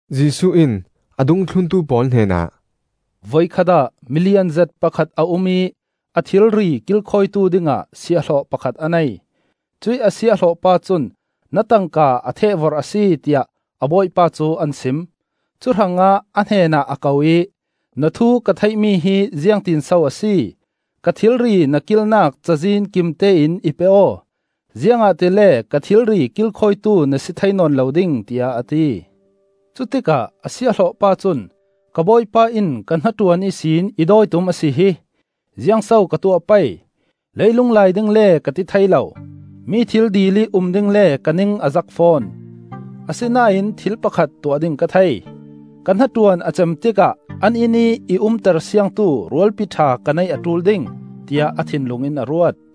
Jesuh in a dungthluntu pawl hnenah, “Voikhat ah milianzet pakhat a um ih a thilri kilkhawitu dingah siahhlawh pakhat a nei. Cuih a siahhlawh pa cun na tangka a thehvorh a si, tiah a bawipa cu an sim. Cuhrangah a hnenah a ko ih ‘Na thu ka theihmi hi ziangtinso a si? Ka thilri na kilnak cazin kimtein i pe aw; ziangahtile ka thilri kilkhawitu na si thei nawn lo ding,’ tiah a ti. Cutikah a siahhlawh pa cun ‘Ka bawipa in ka hnaṭuan ihsin i dawi tum a si hi! Ziang so ka tuah pei? Leilung lai ding le ka ti thei lo; mi thil dil ih um ding le ka ning a zak fawn. Asinain thil pakhat tuah ding ka thei! Ka hnaṭuan a cem tikah an innih i umter siangtu rualpi ṭha ka neih a ṭul ding,’ tiah a thinlung in a ruat.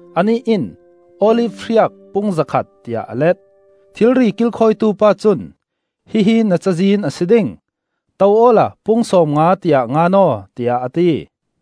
Anih in ‘Olif hriak pung zakhat,’ tiah a let. Thilri kilkhawitu pa cun ‘Hihi na cazin a si ding: to awla pung sawmnga, tiah ngan aw,’ tiah a ti.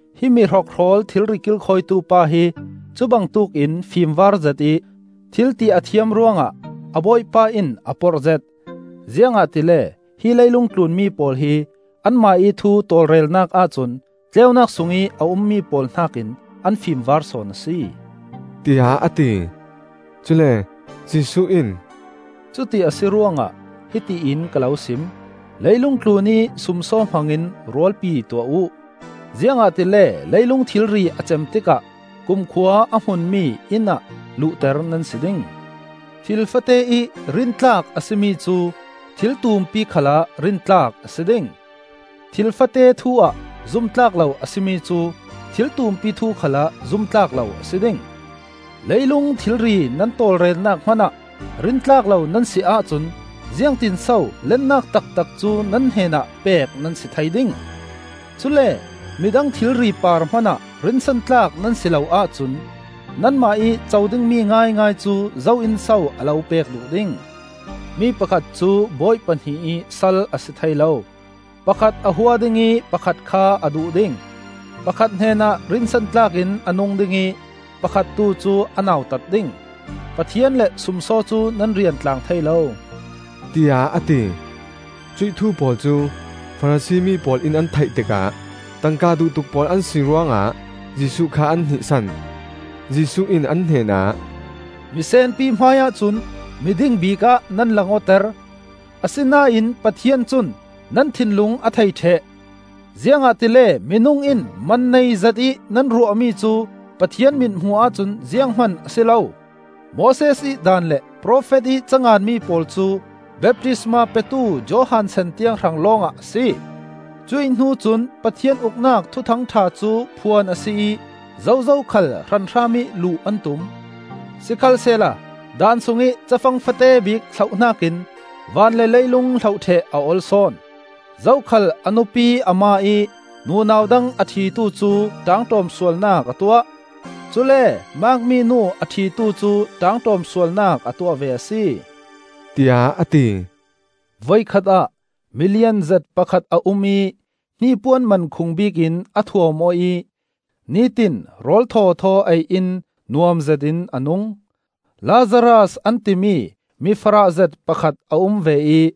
Hi mihrokhrawl thilri kilkhawitu pa hi cubangtuk in fimvar zetih thil ti a thiam ruangah a bawipa in a porhzet, ziangahtile hi leilungtlun mi pawl hi anmah ih thu tawlrelnak ahcun tleunak sungih a ummi pawl hnakin an fimvar sawn a si,” tiah a ti. Cule Jesuh in, “Cuti a si ruangah hiti in ka lo sim: leilung tlunih sumsaw hmangin rualpi tuah uh, ziangahtile leilung thilri a cem tikah kumkhua a hmunmi inn ah luhter nan si ding. Thil fate ih rintlak a si mi cu thil tumpi khalah rintlak a si ding; thil fate thu-ah zumtlak lo a si mi cu thil tumpi thu khalah zumtlak lo a si ding. Leilung thilri nan tawlrelnak hmanah rintlak lo nan si ahcun ziangtinso lennak taktak cu nan hnenah pek nan si thei ding? Cule midang thilri par hmanah rinsantlak nan si lo ahcun nanmah ih co dingmi ngaingai cu zo in so a lo pek duh ding? Mi pakhat cu bawi pahnih ih sal a si thei lo. Pakhat a hua ding ih pakhat kha a duh ding; pakhat hnenah rinsantlak in a nung ding ih pakhat tu cu a nautat ding. Pathian le sumsaw cu nan rian tlang thei lo,” tiah a ti. Cuih thu pawl cu Farasi mi pawl in an theih tikah tangka duh tuk pawl an si ruangah Jesuh kha an hnihsan. Jesuh in an hnenah, “Miseenpi hmaiah cun miding bikah nan lang awter; asinain Pathian cun nan thinlung a thei ṭheh. Ziangahtile minung in man nei zetih nan ruahmi cu Pathian mithmuh ahcun zianghman a si lo. “Moses ih Daan le profet ih canganmi pawl cu baptisma petu Johan san tiang hrang lawngah a si. Cuihhnu cun Pathian Uknak Thuthang ṭha cu phuan a si ih zozo khal hranhram ih luh an tum. Sikhalsehla Daan sungih cafang fate bik hloh hnakin van le leilung hloh ṭheh a ol sawn. “Zokhal a nupi a ma ih nunau dang a ṭhitu cu ṭaangṭawm sualnak a tuah; cule maakmi nu a ṭhitu cu ṭaangṭawm sualnak a tuah ve a si,” tiah a ti. “Voikhat ah milianzet pakhat a um ih hnipuan mankhung bik in a thuam aw ih nitin rawl thawthaw ei in nuam zetin a nung. Lazaras an timi mi farahzet pakhat a um ve ih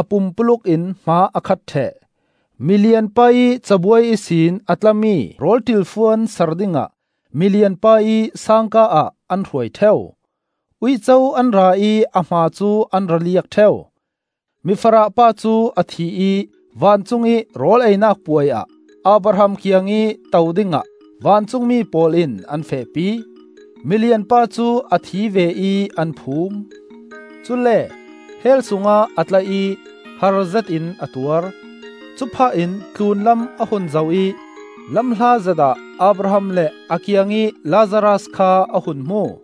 a pumpuluk in hma a khat ṭheh. Milian pa ih cabuai ihsin a tlami rawl ṭilfuan sar dingah milian pa ih sangka ah an hruai ṭheu. Uico an ra ih a hma cu an ra liak ṭheu. Mifarah pa cu a thi ih vancungih rawl ei-nak puai ah Abraham kiangih to dingah vancungmi pawl in an fehpi. Milian pa cu a thi ve ih an phum; cule Hell sungah a tla ih harzet in a tuar. Cuphah in tlunlam a hun zoh ih lamhlatzet ah Abraham le a kiangih Lazaras kha a hun hmu.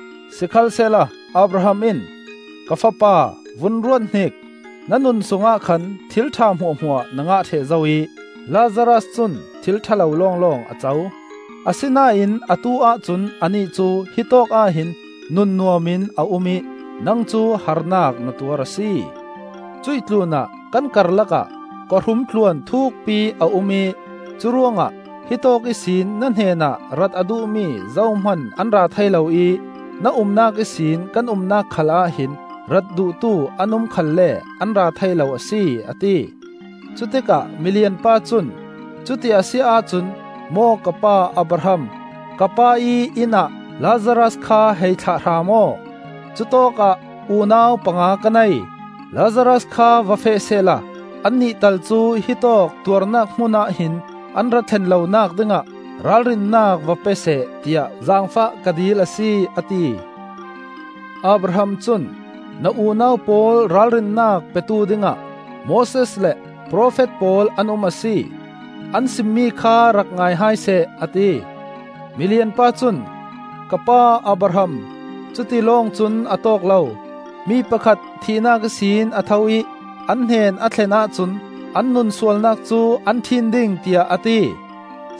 Sikhalsehla Abraham in, ‘Ka fapa, vun ruat hnik! Na nun sungah khan thil ṭha hmuahhmuah na ngah ṭheh zo ih Lazaras cun thil ṭha lo lawnglawng a co. Asinain atu-ah cun anih cu hitawk ah hin nunnuam in a um ih nang cu harnak na tuar a si! Cuih tlunah kan karlakah Kawhrum tluan thukpi a um ih curuangah hitawk ihsin na hnenah rat a duhmi zohman an ra thei lo ih na umnak ihsin kan umnak khalah hin rat duhtu an um khalle an ra thei lo a si,’ a ti. Cutikah milian pa cun ‘Cuti a si ahcun, maw ka pa Abraham, ka pa ih inn ah Lazaras kha hei thlah hram aw. Cutawkah unau panga ka nei. Lazaras kha va feh sehla annih tal cu hitawk tuarnak hmunah hin an ra thlen lonak dingah ralrinnak va pe seh, tiah zaangfah ka dil a si,’ a ti. Abraham cun, ‘Na unau pawl ralrinnak petu dingah Moses le profet pawl an um a si. An simmi kha rak ngai hai seh,’ a ti. Milian pa cun, ‘Ka pa Abraham, cuti lawng cun a tawk lo. Mi pakhat thihnak ihsin a tho ih an hnen a thlen ahcun an nunsualnak cu an ṭhin ding,’ tiah a ti.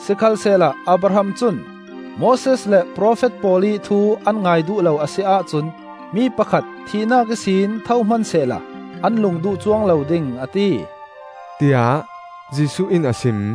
Sikhalsehla Abraham cun, ‘Moses le profet pawl ih thu an ngai duh lo a si ahcun mi pakhat thihnak ihsin tho hmansehla an lung duh cuang lo ding,’ a ti,” tiah Jesuh in a sim.